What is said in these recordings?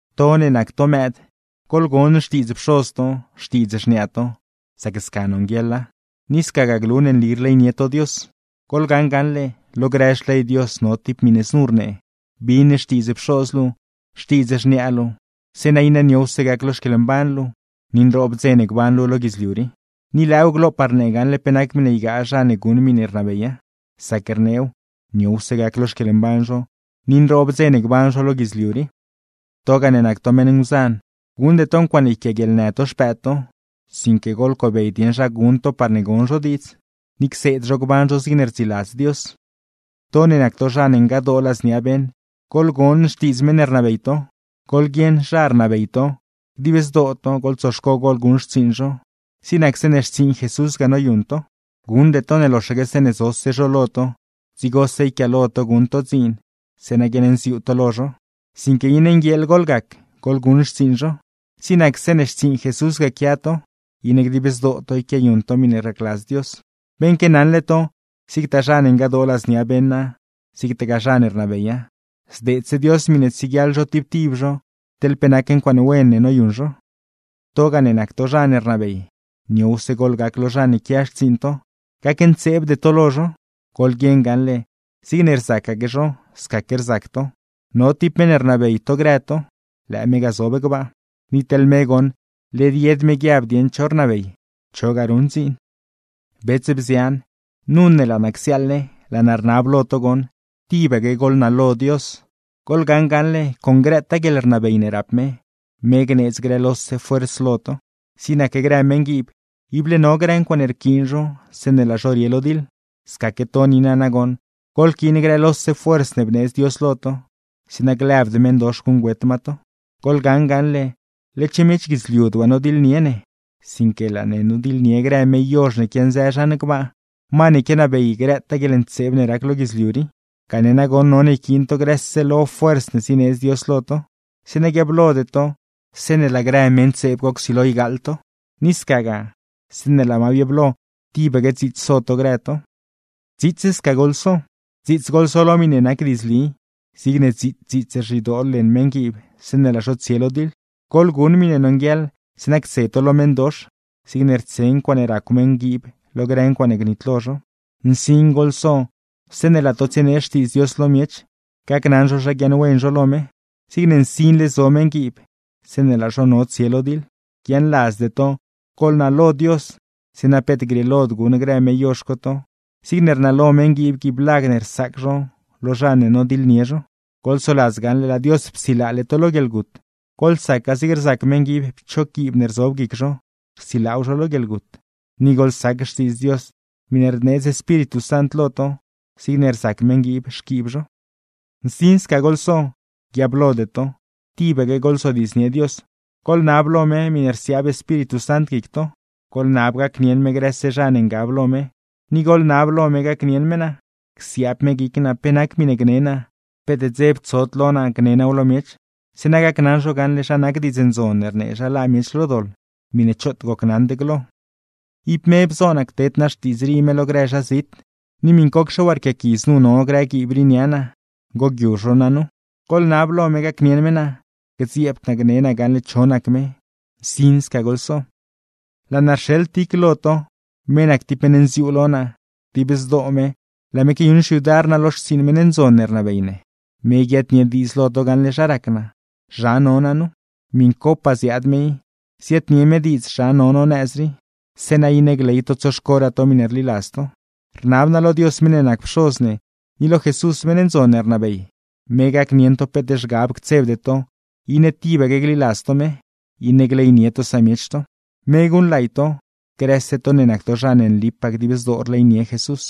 To ne nac to mëëd, goḻgon xtiidz pxoz to, xtiidz xniaa to, sac sca nonguieḻa, ni scagaa glu ne nli rleynie to Dios. Goḻgaṉ gaṉle, lo grë xley Dios no tib miṉe znu rnee: “Bin xtiidz pxoz luu, xtiidz xniaa luu, zeeṉa iṉe niowse gac lo xquieḻmban luu, ni nroob dze ne gban luu lo guidzliu rii.” Ni lëëw glopaa rnee gaṉle pe nac miṉe ygaa zha ne guṉ miṉe rnabeya, sac rneew, niowse gac lo xquieḻmban zho, ni nroob dze ne gban zho lo guidzliu rii. Togaa ne nac to meṉ nguzan, guṉde to ncuaaṉe yquiaaguieḻnë to xpëëd to, sinque goḻcobey dieṉ zha guṉ to parne gon zho diidz, ni cseed zho gban zho zigne rdziladz Dios. To ne nac to zha ne ngadoo ladznia beṉ, goḻgon xtiidz meṉ ne rnabey to. Goḻguieṉ zha rnabey to, dib zdoo to, goḻtsoxco goḻguṉ xtsiiṉ zho, zig nac zeeṉe xtsiiṉ Jesús ga noyuṉ to. Guṉde to ne loxaque zeeṉe zose zho lo to, dzigose yquiaalo to guṉ to dziin zeeṉa guiaṉnziuu to lo zho, sinque iṉe nguieeḻ goḻgac goḻguṉ xtsiiṉ zho, zig nac zeeṉe xtsiiṉ Jesús ga quia to, iṉe dib zdoo to quiayuṉ to miṉe racladz Dios. Beṉque naṉle to, zigtaa zha ne ngadoo ladznia beṉa, zigtagaa zha ne rnabeya, zdeedse Dios miṉe tsieguiaḻ zho tib tib zho teḻ pe nac ncuaaṉe wen ne noyuṉ zho. Togaa ne nac to zha ne rnabey, niowse goḻgac lo zha ne quia xtsiiṉ to, gacntseebde to lo zho. Goḻguieṉ gaṉle, zigne rzacaque zho, scaque rzac to, no tib meṉ ne rnabey to grë to, lëë me ga zob gbaa; ni teḻ me goṉ led yed me guiab dieṉ cho rnabey, chogaa ruṉ dziin. Bets, bzian, nu ne laa naa csiaaḻle, laa naa rnab lo to goṉ tibaque goḻnalo Dios; goḻgaṉ gaṉle, con grëtaa guieḻrnabey ne rap me, me gneedz grë lose fuerz lo to. Zig nac grë meṉguiib, ible no grë ncuaaṉe rquiin zho zeeṉe laa zho rie lo diḻ, scaque to niina nagoṉ, goḻquiin grë lose fuerz ne bneedz Dios lo to, zeeṉa glëbd meṉdox guṉgüet ma to. Goḻgaṉ gaṉle, led-xe miech guidzliud waa nodiḻnie ne, sinque laa ne nodiḻnie grë me yozh ne quianzë zhan gbaa, ma ne quianabey grëtaa guieḻntseeb ne rac lo guidzliu rii. Gane nagoṉ none yquiin to grëse lo fuerz ne zineedzle Dios lo to, zeeṉa guiablode to zeeṉe laa grë me ntseeb co csilo ygaaḻ to; ni scagaa, zeeṉe laa ma biablo, tibaque dziits so to grë to. Dziits sca goḻso: Dziits goḻso lo miṉe nac diidzli, zigne dziits dziits rzhidoo leṉ meṉguiib zeeṉe laa zho tsie lo diḻ. Goḻguṉ miṉe nonguieḻ zeeṉa ctse to lo meṉdox, zigne rtse ncuaaṉe racw meṉguiib lo grë ncuaaṉe gnitlo zho. Nsin goḻso zeeṉe laa to tsienee Xtiidz Dios lo miech gacnaṉ zho zha guiaaṉwen zho lo me, zigne nsinle zo meṉguiib zeeṉe laa zho no tsie lo diḻ. Guiaaṉladzde to, goḻnalo Dios, zeeṉa peet grieelod guṉ grë me yozh co to, zigne rnalo meṉguiib guiiblag ne rsaac zho lo zha ne nodiḻnie zho. Goḻsoladz gaṉle laa Dios psilaale to lo guieḻgut, goḻsaca zigne rzac meṉguiib pchog guiib ne rzob guic zho, rsilaaw zho lo guieḻgut. Ni goḻsac Xtiidz Dios miṉe rneedz Espíritu Sant lo to, zigne rzac meṉguiib xquiib zho. Nsin sca goḻso, guiablode to. Tibaque goḻzodiidznie Dios. Goḻnab lo me miṉe rsiaab Espíritu Sant guic to, goḻnab gacnieṉ me grëse zha ne ngab lo me; ni goḻnab lo me gacnieṉ me naa, csiaab me guic naa pe nac miṉe gne naa, peet dzeb tsod lo naa gne naaw lo miech; zeeṉa gacnaṉ zho gaṉle, zha nac Diidz Ndzon ne rnee zha laa miech lo doḻ, miṉe choot gocnaṉd glo. Ib me bzo naa cteed naa xtiidz rii me lo grë zha zit, ni miṉcocxe waa rquiaqui znu no grë guiib rii nia naa, ngoguiu zho naa nu. Goḻnab lo me gacnieṉ me naa, gdzieebd naa gne naa gaṉle cho nac me. ¡Nsin sca goḻso! Laa naa rxeḻ Tic lo to, me nac tib meṉ nziuu lo naa, dib zdoo me laa me quiayuṉ xyudar naa lo xtsiiṉ meṉ ndzon ne rnabey ne. Me guiaadnie diidz lo to gaṉle zha rac naa, zha no naa nu. Miṉcopaa ziaad me i, ziaadnie me diidz zha no no nëz rii, zeeṉa iṉe gley to tsoxcoraa to miṉe rliladz to. Rnab naa lo Dios meṉ ne nac Pxoz ne, ni lo Jesús meṉ ndzon ne rnabey, me gacnieṉ to peet zhgab ctsebde to, iṉe tibaque gliladz to me, iṉe gleynie to samiech to. Me guṉlay to, grëse to ne nac to zha ne nlipaa dib zdoo rleynie Jesús.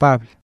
Pabl